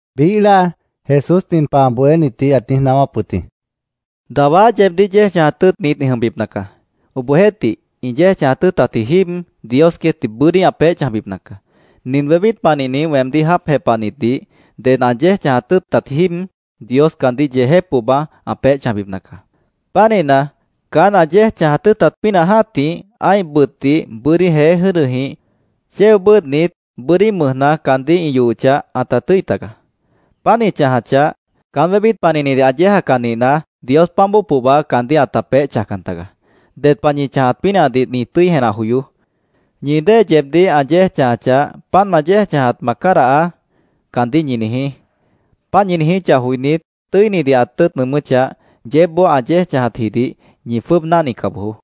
Biíh láa, Jesús nin pah ã bohénitdih ãt niíj naáwáp wʉt jĩ: “Dawá yeebdíh yéej chãjat tʉ́ʉtnit ĩ jʉmbipna caá. Obohjeéhtih, ĩ yéej chãjat tʉ́ʉtatji jíib, Dios queétdih bʉ́dí ã peéh chãjbipna caá. Nin wébít panihni weemdíh jáap jepahnitdih ded ã yéej chãjat tʉ́ʉtatji jíib Dios caandíh yeejép pohba ã peéh chãjbipna caá. Pánihna, caán ã yéej chãjat tʉ́ʉtat pínah jã́tih, ã́ih bʉtdih bʉ́dí jeé jʉ́dʉjĩh chéo bʉ́ʉdhnit, bʉ́dí mʉjna caandíh ĩ yohochah, ãta tʉ́i taga. Páant ĩ chãjachah, caán wébít panihnidih ã yéejacah nihna, Dios páant bóo pohba caandíh ãta peéh chãjcan taga. Ded pah ñi chãjat pínahdih ñi tʉ́i jenah joyoó. Ñi dée yeebdíh ã yéej chãjachah, ‘Páant ma chãjatdih ma cádahaá’, caandíh ñi niijí. Páant ñi niijíchah joinít, tʉ́inidih ã tʉ́ʉt nʉʉmʉ́chah, yeébboó ã yéej chãjatjidih ñi jwʉ́ʉb náhnica bojoó.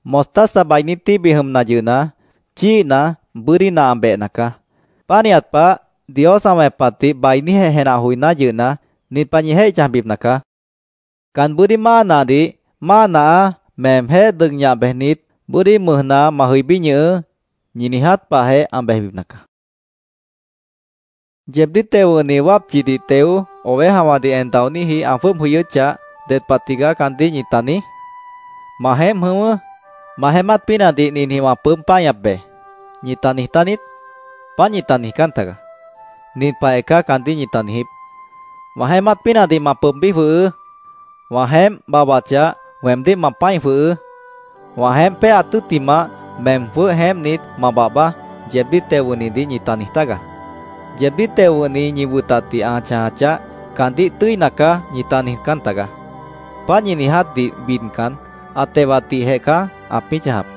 —Mostaza bainí tíbih jʉmna yʉhna, chíihna, bʉ́dí nah ã behna caá. Pánihat pah, Dios ã wẽpatdih bainíjeh jenah joiná yʉhna, nin pah ñi jéih chãjbipna caá: Can bʉ́dí máa nahdih ‘Máa nahaá, meemjéh dʉg ñah bejnit, bʉ́dí mʉjna ma jʉibí ñʉhʉʉ́’, ñi niiját pahjeh ã bejbipna caá, Jesús queétdih ãt niijíp wʉt jĩ. “¿Yeebdíh teo wʉ̃hni wápchidih teo, ovejawãdih en daoníji ã jwʉ́ʉb jʉyʉ́chah, ded pah tigaá caandíh ñita niíj? ‘Ma jeémp jʉ̃ʉ́wʉ́. Ma jeémát pínahdih ninjĩh wã pʉʉ́b páñap be’, ¿ñita niijtá niít? Páant ñita niijcán tagaá. Nin pahjeh caá caandíh ñita niijíp: ‘Wã jeémát pínahdih ma pʉʉbbí jwʉhʉʉ́. Wã jeémp babhbachah, weemdíh ma pã́i jwʉhʉʉ́. Wã jeémp péaat tʉ́ttimah, meem jwʉ́h jeémpnit ma babhbaá’, yeebdíh teo wʉ̃hnidih ñita niij tágaá. Yeebdíh teo wʉ̃hni ñi wʉtatdih ã chãjachah, caandíh ‘Tʉ́ina caá’, ñita niijcán tagaá. Páant ñi niijátdih bidcan, ã tewatdihjeh caá ãpĩ́ chãjap.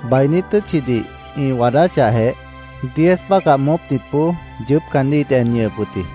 Bainí tʉ́tchidih ĩ waadáchahjeh, diez bácah moópnitboó yʉʉ́p caandíh ĩt en ñʉhʉp wʉt jĩ.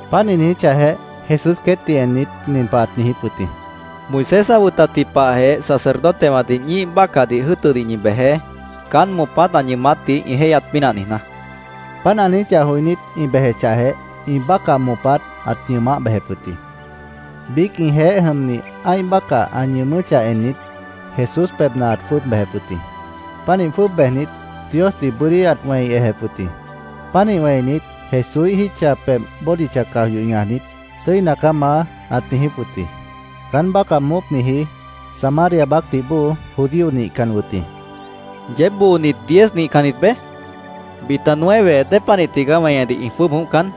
Páant ĩ niíj ejechah, Jesús queétdih ennit, nin pah ãt niijíp wʉt jĩ: —Moisés ã wʉtatji pahjeh sacerdotewãdih ñíih bácahdih jʉ́ʉtʉdih ñi bejeé, caán moopát ã ñʉʉmátdih ĩ jéihyat pínah niijná, ãt niijíp wʉt jĩ. Páant ã niijíchah joinít, ĩ bejechahjeh, ĩ́ih bácah moopát ãt ñʉʉmáh bejep wʉt jĩ. Biíc ĩjeéh jʉmni ã́ih bácah ã ñʉʉmʉ́chah ennit, Jesús pebhna ãt jwʉ́ʉb bejep wʉt jĩ. Pánih jwʉ́ʉb bejnit, Diosdih bʉ́dí ãt wẽi ejep wʉt jĩ. Pánih wẽinit, Jesúíh jítcha pebh bódicha caj yoh ñajnit, “Tʉ́ina caá, Maá”, ãt niijíp wʉt jĩ. Caán bácah moópniji Samaria baácdih bóo judío nihcan wʉt jĩ. —¿Yeéb boonit diez nihcannit beé? ¿Bita nueve dépanih tigaá weñedih ĩ jwʉ́ʉb jʉ̃óhcan?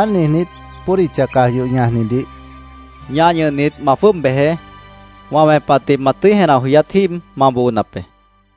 Páant niijnít, bódicha caj yoh ñajnidih —Ñah ñʉhnit, ma jwʉ́ʉb bejeé. Wã wẽpatdih ma tʉ́i jenah joyát jíib ma boonap be, ãt niijíp wʉt jĩ.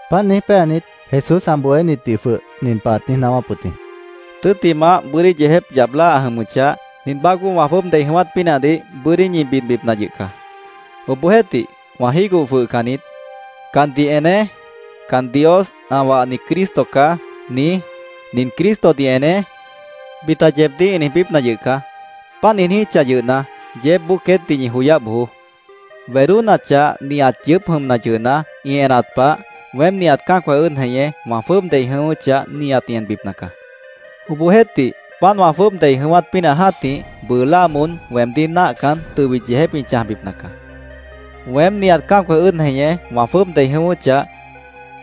Páant niíj péanit, Jesús ã bohénitdih jwʉh nin pah ãt niíj naáwáp wʉt jĩ: —Tʉ́ttimah, bʉ́dí yeejép yap láa ã jʉmʉchah, nin baácboó wã jwʉ́ʉb dei jʉ̃ʉ́wát pínahdih bʉ́dí ñi bidbipna yʉh caá. Obohjeéhtih, wã jígoh jwʉhcan niít. ‘Candih eneé. Can Dios ã wahni Cristo caá’, niíj, ‘Nin Cristodih eneé’, bita yeebdíh ĩ niijbípna yʉh caá. Páant ĩ niijíchah yʉhna, yeébboó queétdih ñi joyáh bojoó. Wedónachah, nihat yʉʉ́p jʉmna yʉhna, ĩ enat pah, weém nihat cã́acwã ʉ́ʉd jeñé, wã jwʉ́ʉb dei jʉ̃ʉ́wʉ́chah, nihat ĩ enbipna caá. Obohjeéhtih, páant wã jwʉ́ʉb dei jʉ̃ʉ́wát pínah jã́tih, bʉʉ láa moón weemdíh náahcan, tʉbit yeejép ĩ chãjbipna caá. Weém, nihat cã́acwã ʉ́ʉd jeñé wã jwʉ́ʉb dei jʉ̃ʉ́wʉ́chah,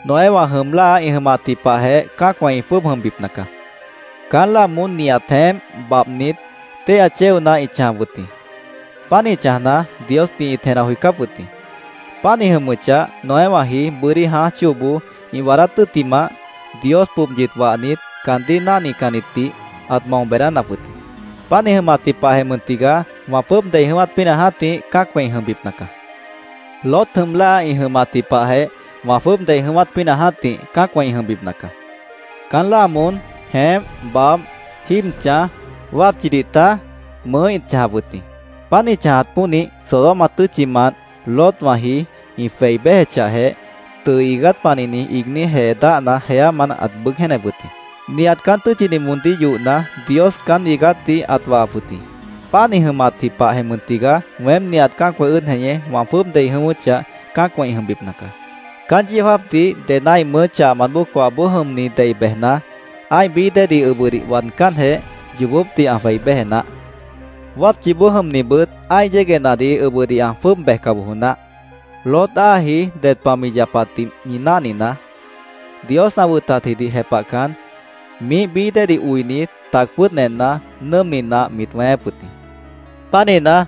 Noéwã jʉm láa ĩ jʉmatji pahjeh cã́acwã ĩ jwʉ́ʉb jʉmbipna caá. Caán láa moón nihat jeémp babhnit, téihya chéona ĩt chãjap wʉt jĩ. Pánih chãjna, Diosdih ĩt jenah joicáp wʉt jĩ. Páant ĩ jʉmʉchah, Noéwãji bʉ́dí jãáj chóoboó ĩ waadát tʉ́ttimah, Dios pobyit wahnit, caandíh náahcannitdih ãt mao beedánap wʉt jĩ. Páant ĩ jʉmatji pahjeh mʉn tigaá wã jwʉ́ʉb dei jʉ̃ʉ́wát pínah jã́tih cã́acwã ĩ jʉmbipna caá. Lot jʉm láa ĩ jʉmatji pahjeh, wã jwʉ́ʉb dei jʉ̃ʉ́wát pínah jã́tih, cã́acwã ĩ jʉmbipna caá. Caán láa moón jeémp, babh, jíib chãj, wápchidih taj, mʉʉ́ ĩt chãjap wʉt jĩ. Páant ĩ chãjat pónih, Sodoma tʉ́tchimant Lotwãji ĩ jwei béjechahjeh, tʉʉ iigát panihni iigní jee dáhna jeámant ãt bʉʉ́g jéenep wʉt jĩ. Nihat caán tʉ́tchidih moondíh yohna, Dios caán iigátdih ãt wahap wʉt jĩ. Páant ĩ jʉmatji pahjeh mʉn tigaá weém nihat cã́acwã ʉ́ʉd jeñé, wã jwʉ́ʉb dei jʉ̃ʉ́wʉ́chah, cã́acwã ĩ jʉmbipna caá. “Caán yeó jáapdih ded ã́ih mʉʉ́ chahmant bóo coahboó jʉmni dei bejna, ã́ih bií déedih ʉbʉdih waadcánjeh, yoobópdih ã jwei béje naáh. Wápchiboó jʉmnibʉt ã́ih yéguehnadih ʉbʉdih ã jwʉ́ʉb bejca bojo naáh. Lot áaji ded pah mi yapatdih ñi náhninaá. Dios ã wʉtatjidih jepahcan, miíh bií déedih oinit, tac pʉ́ʉd enna, nʉ́ʉmni nah mit wẽéép wʉt jĩ. Pánihna,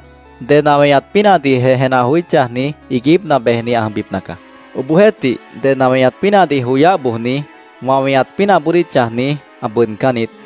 ded ã weñat pínahdihjeh jenah joí chãjni, iiguípna bejni ã jʉmbipna caá. Obohjeéhtih, ded ã weñat pínahdih joyáh bojni, wã weñat pínahboodíh chãjni, ã bʉʉdcán niít.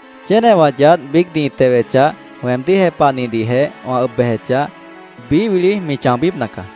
Chénewã yaádh biícdih ĩ tewechah, weemdíh jepahnihdihjeh wã ʉb bejechah, biíh wili chãobípna caá.